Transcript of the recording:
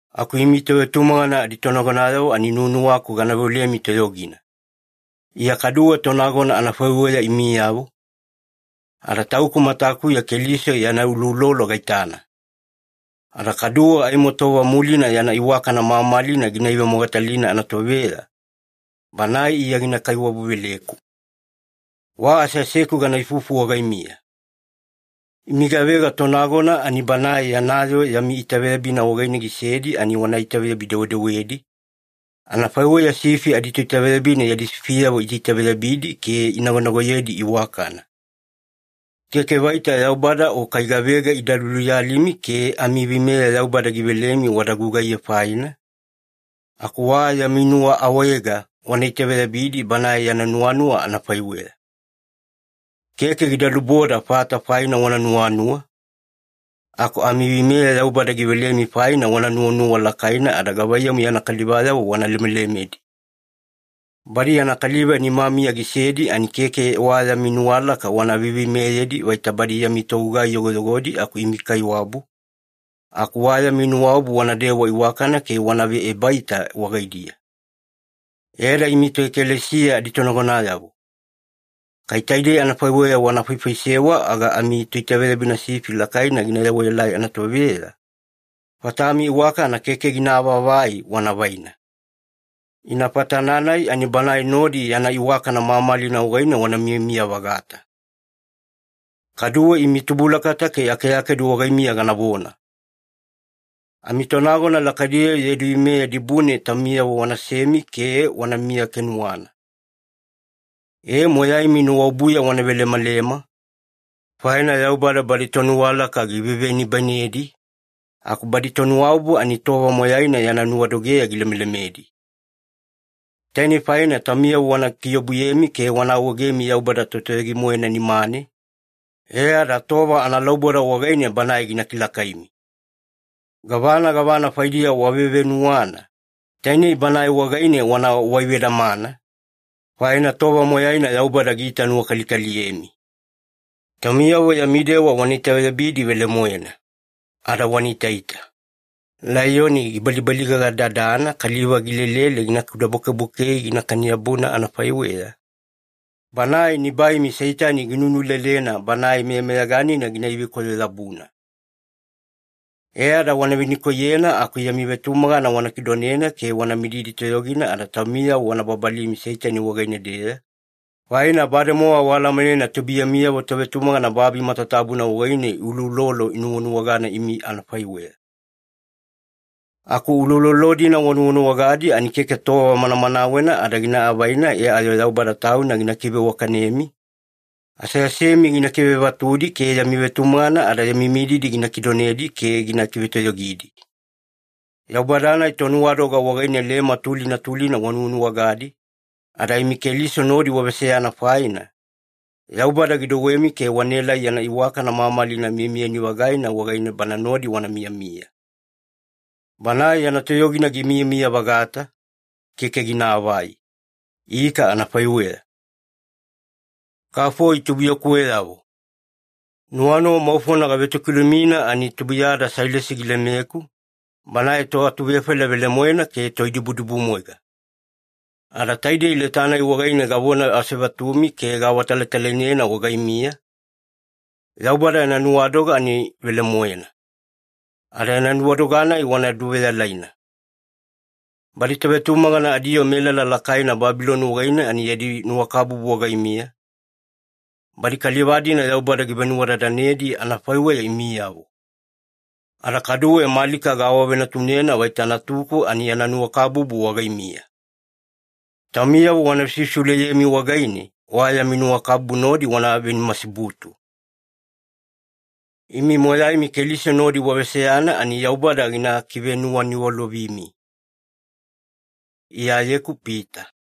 Aku imi tovetumagana aditonagonayavo ani nuwanuwaku gana veolemi toyogina. Iya kaduwe tonagona anafaiweya imiyavo, ada tauku matakuya Keliso yana uloulolo gaitana. Ada kaduwe aimo tova mulina yana iwakana mamalina gina ivemogatalina anatoveya, Banae Iya gina kaiwabu-veleku. Wa aseaseku gana ifufu wagaimiya. Imi gavega tonagona ani Banae yana yoo yami itaveyabina wagaine gisedi ani wana itaveyabi-dewedewedi, anafaiweya sifi aditoitaveyabina yadi sifiyavo iitaitaveyabidi ke inagonagoyedi iwakana. Keke vaita Yaubada o kai gavega ida luluyalimi ke amiveimeya Yaubada givelemi wada gugaiye faina, aku wa yami nuwaawaega wana itaveyabidi Banae yana nuwanuwa anafaiweya. Keke gida luboda fata faina wana nuwanuwa, aku amiveimeya Yaubada givelemi faina wana nuwanuwa lakaina ada gavaiyamu yana kalivayavo wana lemelemedi. Badi yana kaliva nimamiya gisedi ani keke wa yami nuwalaka wana veiveimeyedi vaita badi yami togugai yogoyogodi aku imi kaiwabu, aku wa yami nuwaobu wanadewa iwakana ke wanave ebaita wagaidiya. E ada imi toekalesiya aditonagonayavo, kai taidei anafaiweya wana faifaisewa aga aimo Toitaveyabina Sifi Lakaina gina yewaelai anatoveya, fatami iwakana keke gina avaavai wana vaina. Ina fatana-nai ani Banae nodi yana iwakana mamalina wagaine wana miyamiya-vagata. Kaduwe imi tubulakata ke akeakedu wagaimiya ganavona. Amitonagona lakaidiyavo yadi veimeya dibune taumiyavo wanasemi ke wanamiya kenuwana. E, moyaimi nuwaobuya wana velemalema, faina “Yaubada badi tonuwalaka givevenibainedi, aku badi tonuwaobu ani tova moyaina yana nuwadogeya gilemelemedi.” Tainei faina taumiyavo wana kiobuyemi ke wana awaegemi Yaubada Totoyogi-moena nimane, e ada tova analauboda wagaine Banae gina kilakaimi. Gavana gavana faidiya wavevenuwana, tainei Banae wagaine wana waivedamana, faina tova moyaina Yaubada giitanuwakalikaliyemi. Taumiyavo yami dewa wana itaveyabidi velemoena. Ada wana itaita. Laiyoni gibalibaligaga-dadana kaliva gilelele gina kudabwakebwakei ginakani-yabuna anafaiweya, banae nibaimi Seitani ginunulelena banae meyameyaganina gina ivekoyo-yabuna. E ada wana venikoiyena aku yami vetumagana wana kidonena ke wana mididi toyogina ada taumiyavo wana babalimi Seitani wagaine-deya, faina bademowa waalamanena tubuiyamiyavo tovetumagana babi matatabuna wagaine uloulolo inuwanuwagana imi anafaiweya. Aku uloulolo-dina wanuwanuwagadi ani keke tova manamanawena ada gina avaina e ayo Yaubada Tauna gina kiveiwakanemi, aseasemi gina kivevatudi, ke yami vetumagana ada yami mididi gina kidonedi ke gina kivetoyogidi. Yaubada-nai Tonuwadoga wagaine lema tulina tulina wanuwanuwagadi, ada imi Keliso nodi waveseyana faina, Yaubada gidouwemi ke wanaelai yana iwakana mamalina miyamiyani-vagaina wagaine Bana nodi wana miyamiya. Banae yana toyogina gimiyamiya-vagata, keke ginaavai. Ika anafaiweya. Kafoi tubuiyakuweyavo. Nuwanuwa maufona gavetokilumina ani tubuiyada Sailasi gilemeku, banae toatuvefaila velemoena ke toidibudibumwaiga. Ada taidei leta-nai wagaine gavona asevatumi ke gaawatalatalainena wagaimiya, Yaubada yana nuwadoga ani velemoena. Ada yana nuwadoga-nai wana duveyalaina. Badi tovetumagana adiyoo melala lakaina Babiloni wagaine ani yadi nuwakabubu wagaimiya, badi kaliva-dina Yaubada givenuwadadanedi anafaiweya imiyavo. Ada kaduwe Malika gaawavenatunena vaita natuku ani yana nuwakabubu wagaimiya. Taumiyavo wana vesivesiuleyemi wagaine, wa yami nuwakabubu nodi wana venimasibutu. Imi moyaimi Keliso nodi waveseyana ani Yaubada gina kivenuwaniwalovimi. Iyayeku Pita